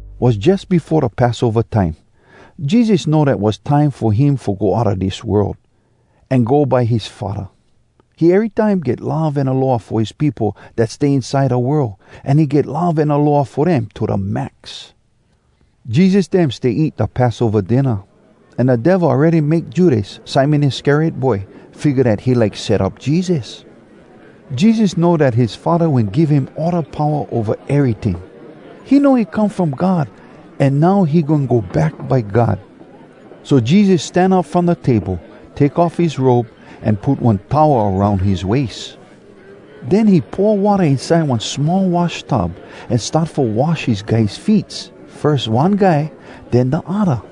Was jus befo da Passova time. Jesus know dat was time fo him fo go outa dis world, an go by his Faddah. He erytime get love an aloha fo his peopo dat stay inside da world, an he get love an aloha fo dem to da max. Jesus dem stay eat da Passova dinna. An da Devil awready make Judas, Simon Iscariot boy, figga dat he like set up Jesus. Jesus know dat his Faddah wen give him all da powa ova eryting. He know he come from God an now he goin go back by God. So Jesus stan up from da table, take off his robe, an put one towel aroun his wais. Den he pour watta inside one small wash tub, an start fo wash his guys feets, firs one guy, den da odda.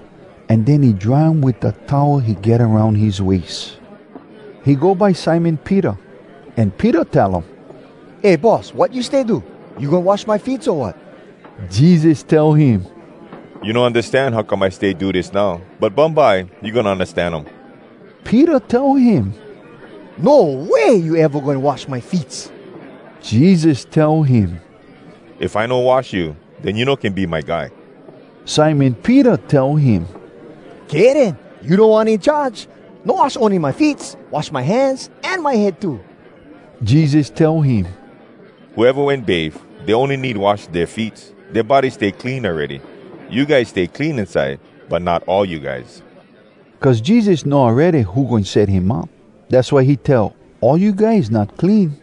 An den he dry um wit da towel he get aroun his wais. He go by Simon Peter. An Peter tell um, “Eh, Boss! Wat you stay do? You goin wash my feets, o wat?!” Jesus tell him, “You no undastan how come I stay do dis now, but bumbye you goin undastan um.” Peter tell him, “No way you eva goin wash my feets!” Jesus tell him, “If I no wash you, den you no can be my guy.” Simon Peter tell him, “Kay den, you Da One In Charge! No wash ony my feets. Wash my hands an my head too!” Jesus tell him, “Whoeva wen bafe, dey ony need wash dea feets. Dea body stay clean awready. You guys stay clean inside, but not all you guys.” (Cuz Jesus know awready who goin set him up. Dass why he tell, “All you guys not clean.”)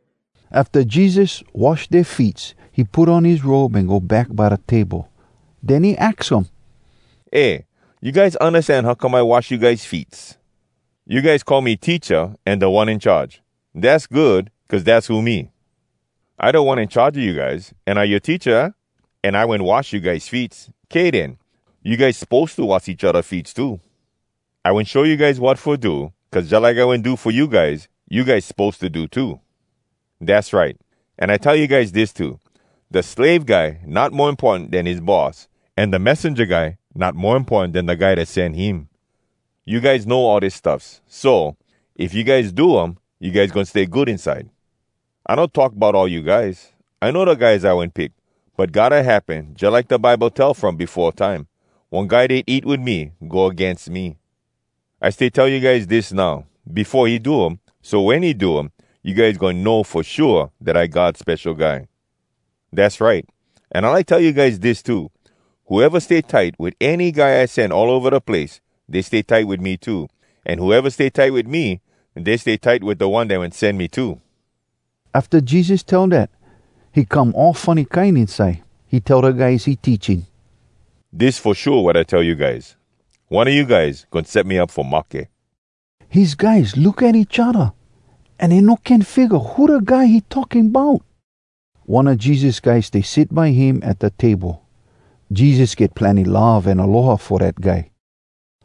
Afta Jesus wash dea feets, he put on his robe an go back by da table. Den he aks um, “Eh, you guys undastan how come I wash you guys feets? You guys call me ‘Teacha’ an ‘Da One In Charge.’ Dass good, cuz dass who me. I Da One In Charge a you guys, an I yoa Teacha, aah? An I wen wash you guys feets. Kay den. You guys suppose to wash each odda feets too. I wen show you guys wat fo do, cuz jalike I wen do fo you guys, you guys suppose to do too. Dass right! An I tell you guys dis too: Da slave guy not mo importan den his boss. An da messenja guy not mo importan den da guy dat sen him. You guys know all dis stuffs. So, if you guys do um, you guys goin stay good inside. “I no talk bout all you guys. I know da guys I wen pick. But gotta happen jalike da Bible tell from befo time, ‘One guy dat eat wit me go agains me.’ I stay tell you guys dis now, befo he do um, so wen he do um, you guys goin know fo shua dat I God Spesho Guy. Dass right! An I like tell you guys dis too: Whoeva stay tight wit any guy I sen all ova da place, dey stay tight wit me too. An whoeva stay tight wit me, dey stay tight wit da One wen sen me too.” Afta Jesus tell dat, he come all funny kine inside. He tell da guys he teaching, “Dis fo shua wat I tell you guys: One a you guys goin set me up fo mahke.” His guys look at each odda, an dey no can figga who da guy he talking bout. One a Jesus guys stay sit by him at da table. Jesus get plenny love an aloha fo dat guy.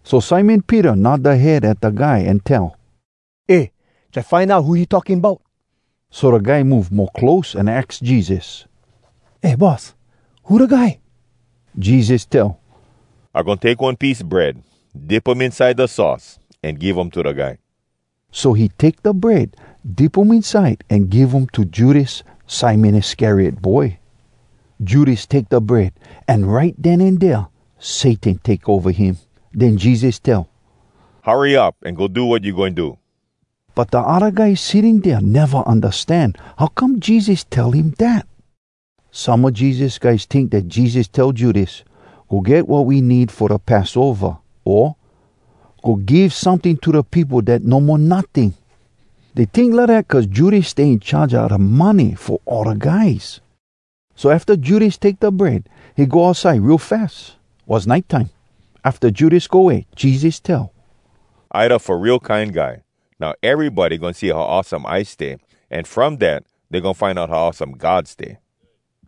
So Simon Peter nod da head at da guy an tell, “Eh! Try find out who he talking bout.” So da guy move mo close an aks Jesus, “Eh, Boss! Who da guy?” Jesus tell, “I goin take one piece bread, dip um inside da sauce, an give um to da guy.” So he take da bread, dip um inside, an give um to Judas, Simon Iscariot boy. Judas take da bread, an right den an dea, Satan take ova him. Den Jesus tell, “Hurry up an go do wat you goin do!” But da odda guys sitting dea neva undastan how come Jesus tell him dat. Some a Jesus guys tink dat Jesus tell Judas, “Go get wat we need fo da Passova,” o “Go give someting to da peopo dat no mo notting.” Dey tink lidat cuz Judas stay in charge a da money fo all da guys. So afta Judas take da bread, he go outside real fas. Was nite time. Afta Judas go way, Jesus tell, “I da Fo Real Kine Guy. Now erybody goin see how awesome I stay. An from dat, dey goin find out how awesome God stay.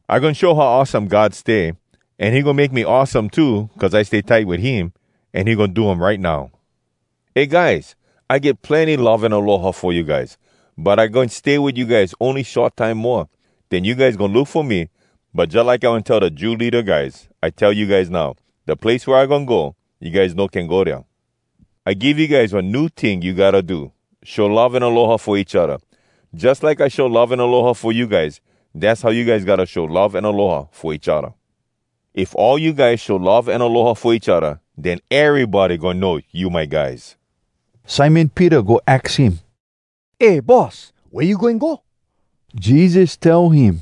I goin show how awesome God stay, an he goin make me awesome too, cuz I stay tight wit him. An he goin do um right now. Eh guys! I get plenny love an aloha fo you guys! But I goin stay wit you guys ony short time moa. Den you guys goin look fo me, but jalike I wen tell da Jew leada guys, I tell you guys now, ‘Da place wea I goin go, you guys no can go dea.’ “I give you guys one new ting you gotta do: Show love an aloha fo each odda! Jus like I show love an aloha fo you guys, dass how you guys gotta show love an aloha fo each odda. If all you guys show love an aloha fo each odda, den erybody goin know you my guys.” Simon Peter go aks him, “Eh, Boss, wea you goin go?” Jesus tell him,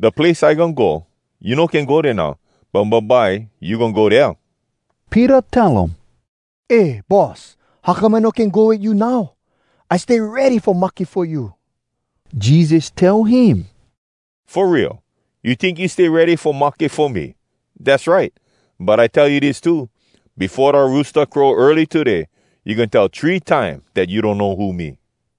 “Da place I goin go, you no can go dea now, but bumbye you goin go dea.” Peter tell um, “Eh, Boss, how come I no can go wit you now? I stay ready fo mahke fo you!” Jesus tell him, “Fo real? You tink you stay ready fo mahke fo me? Dass right! But I tell you dis too: Befo da roosta crow early today, you goin tell three time dat you donno who me!”